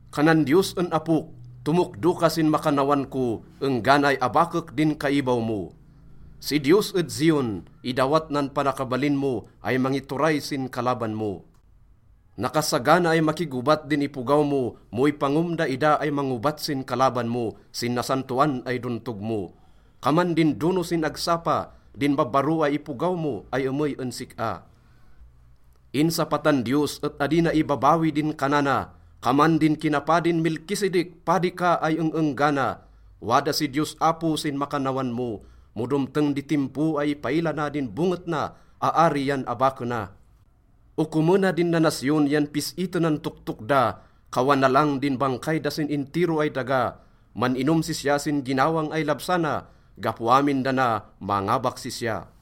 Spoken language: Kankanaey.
Kanan Diyos en Apok, “Tomokdo ka sin makannawan ko enggana ay abakek din kaibaw mo.” Si Diyos ed Zion, idawat nan panakabalin mo ay mangituray sin kalaban mo. Nakasagana ay makigobat din ipogaw mo mo ipangom daida ay mangobat sin kalaban mo sin nasantaon ay dontog mo. Kaman din dono sin agsapa din babbaro ay ipogaw mo ay emey en sik-a. Insapatan Diyos et adi na ibabawi din kanana, “Kaman din kinapadin Melkizedek, padi ka ay eng-enggana.” Wada si Diyos Apo sin makannawan mo. Mo domteng di timpo ay ipaila na din bonget na, aari yan abakena. Okomena din nanasyon yan pis-itenan toktok da, kawanalang din bangkay da sin intiro ay daga. Man-inom sisya sin ginawang ay labsana. Gapo amin dana, mangabak sisya.